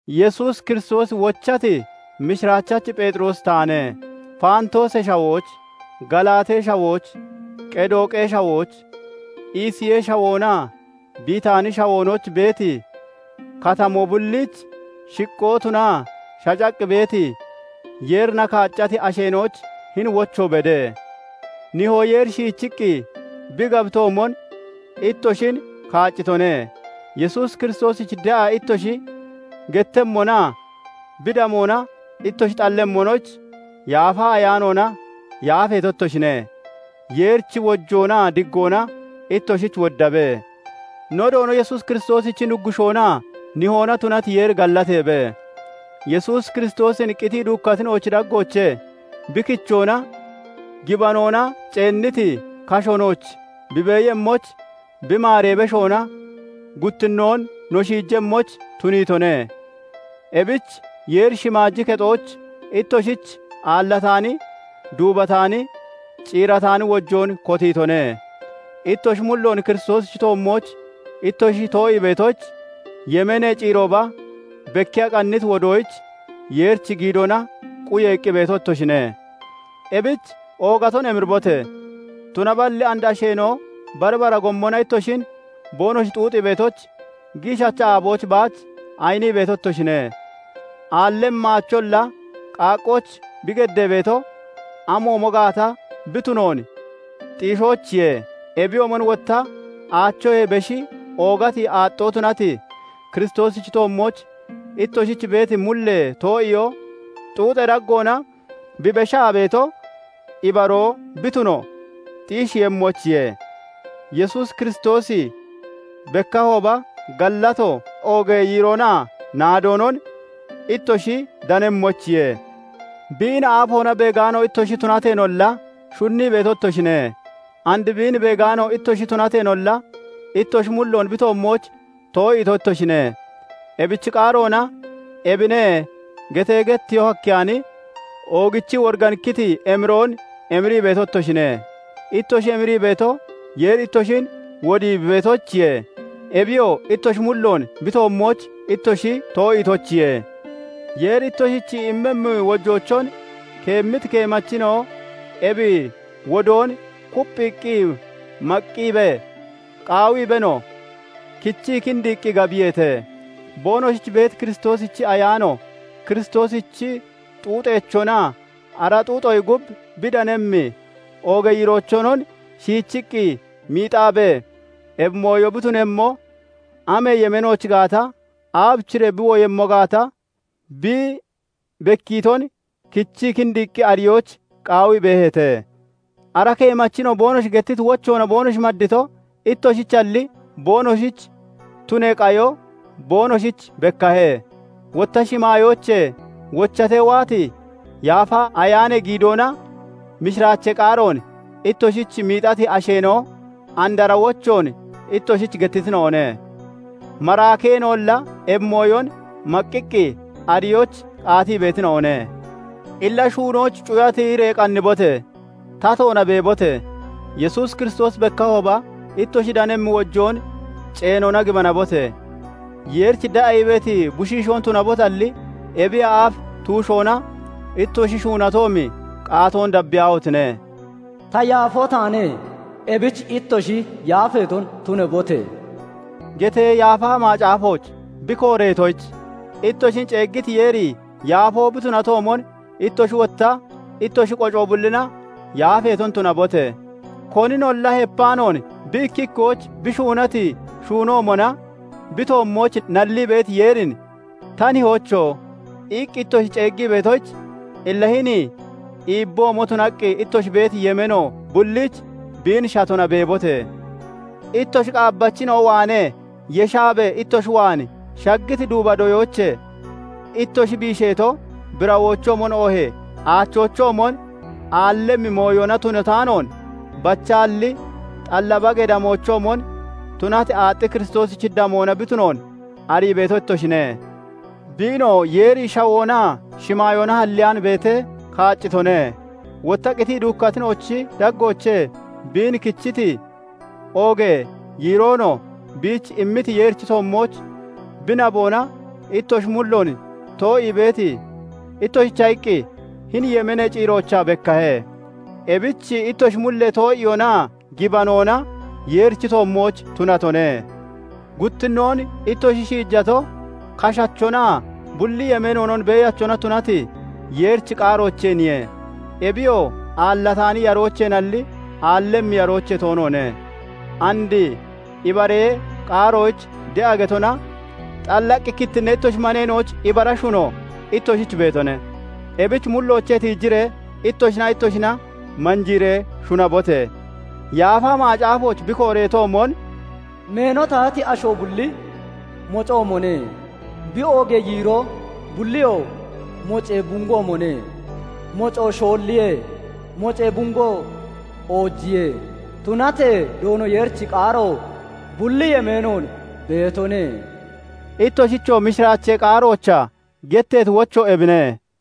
Yesuus Kiristoosi wochati mishiraachachi Pheexiroosi taane. Faantoosee Shawooch, Galaatee Shawooch, Qedooqee Shawooch, Isiyee Shawoonaa Bitaanee Shawoonooch beeti katamoo bulliich shiqqoo tunaa shacaqqi beeti, Yeerina kaaccati asheena'oyich hini wocho bede. Nihoo Yeeri shiichiqqi bi gabitoomon, ittoshin kaaccitone; Yesuus Kiristoosich de'a ittoshi gettemmonaa bi damoona ittoshi xallemmonoyich, Yaafa Ayaanoona yaafeeto ittoshine. Yeerichi wojoonaa diggoona ittoshich woddabe. No Doono Yesuus Kiristoosichi Nuggushoonaa Nihoona tunati Yeeri gallateebe. Yesuus Kiristoosin qitii duukkatina'ochi daggoochee bi kichoona, gibanoona ceenniti kasho nooch bi beeyemmoyich, bi maaree beshoona guttinnoon no shiijemmoyich tuniitone. Ebich Yeeri shimaaji kexooch ittoshich aallataani, duubataani, ciirataani wojoon kotiitone. Ittoshi mulloon Kiristoosichi toommooch ittoshi too'ii beetoyich, yemeenee ciirooba bekkiya qanniti wodoyich Yeerichi giidoona quyeeqqi beeto ittoshine. Ebich oogaton emiribote! Tunaballi and asheena'o bari bara gommona ittoshin boonoshi xuuxii beetoyich, giishacha aaboyich baach ayinii beeto ittoshine. Aallemmi aacholla qaaqqooch bi geddee beeto, amoomo gaata bi tunoon xiishoyichiye; ebiyoomon wotta aachoyee beshi oogati aaxxoo tunati, Kiristoosichi toommooch ittoshich beeti mullee too'iyoo xuuxee daggoona bi beshaa beeto, ibaroo bi tuno xiisheeyemmoyichiye; Yesuus Kiristoosi bekkahooba, gallato, oogee yiiroonaa naadoonon ittoshi danemmoyichiye. Biin aafoona beegaano ittoshi tunateenolla, shunnii beeto ittoshine; and biin beegaano ittoshi tunateenolla, ittoshi mulloon bi toommooch too'iito ittoshine; ebich qaaroona "Ebine" getee getteyoo hakkeyaani, oogichii woriganikkiti emiroon emirii beeto ittoshine. Ittoshi emirii beeto, Yeeri ittoshin wodii bi beetoyichiye; ebiyoo ittoshi mulloon bi toommooch ittoshi too'iitoyichiye. Yeeri ittoshich immemmi wojeechon keemmiti keemachina'o ebi wodoon kupphiiqqi maqqiibee, qaawiibeenoo kichii kindiiqqi gabiyeete. Boonoshich beeti Kiristoosichi Ayaano, Kiristoosichi xuuxeechonaa ara xuuxoyee gub bi danemmi oogee yiireechonon shiichiqqi miixaabee, ebi mooyo bi tunemmo amee yemeenooch gaata, aabichiree bi woyemmo gaata bi bekkiiton kichii kindiiqqi ariyoyich qaawii beeheete. Ara keemachina'o boonoshi gettiti wochoona boonoshi maddito, ittoshichalli, boonoshich tunee qayo boonoshich bekkahe; wotta shimaayoochee wochatee waati Yaafa Ayaanee giidoona mishiraachee qaaroon ittoshich miixati asheena'o and ara wochoon ittoshich gettitina'one; maraakeena'olla ebi mooyon maqqiqqi ariyoyich qaatii beetina'one. Illa shuunoyich cuya tiyiree qannibote! Tatoona beebote! Yesuus Kiristoosi bekkahooba ittoshi danemmi wojoon ceenoona gibanabote! Yeerich de'a ii beeti bushiishoon tunabotalli, ebiyee aaf tuushoona ittoshi shuunatoomi qaatoon dabbiyaahotine! "Ta yaafoo taane; ebich ittoshi yaafeeton tunabote!" getee Yaafa Macaafooch bi kooreetoyich, ittoshin ceeggiti Yeeri yaafoo bi tunatoomon, ittoshi wotta ittoshi qoco bullina yaafeeton tunabote! Koninolla hepaanoon bi ikki ikkoyich bi shuunati shuunoomona bi toommooch nallii beeti Yeerin "Ta Nihoocho!" iqqi ittoshi ceeggii beetoyich, illa hini iibboomo tunaqqi, ittoshi beeti yemeeno bulliich biin shatona beebote! Ittoshi qaabbachina'o waanee yeshaabee ittoshi waan shaggiti duuba doyoochee ittoshi biisheeto, birawoochoomon oohee aachoochoomon aallemmi mooyona tunataanoon, bachaalli xalla bagee damoochoomon tunati, aaxxi Kiristoosichi damoona bi tunoon arii beeto ittoshine. Biinoo Yeeri shawoonaa shimaayoona halleyaan beetee kaaccitone; wotta qitii duukkatina'ochi daggoochee biin kichiti, oogee yiiroonoo biich immiti Yeerichi toommooch bi naboona ittoshi mulloon too'ii beeti ittoshicha iqqi hini yemeenee ciiroochaa bekkahe. Ebich ittoshi mullee too'iyoonaa gibanoona Yeerichi toommooch tunatone. Guttinnoon ittoshi shiijato, kashachonaa bulli yemeenoon beeyachona tunati Yeerichi qaaroocheeniye; ebiyoo aallataani yaroocheenalli, aallemmi yaroochee toonoone; and ibaree qaaroyich de'a getona xallaqqi kittinnee ittoshi maneena'oyich ibara shuno ittoshich beetone; ebich mulloochee tiijiree ittoshinaa ittoshina manjiiree shunabote! Yaafa Macaafooch bi kooreetoomon, "Meeno tahati asho bulli mocoomone; Bi oogee yiiroo bulliyoo mocee bungoomone; Mocoo shoolliye; mocee bungoo oojiye; Tunatee Doono Yeerichi qaaro bulli yemeenoon beetone." Ittoshichoo mishiraachee qaaroochaa getteeti wocho ebine.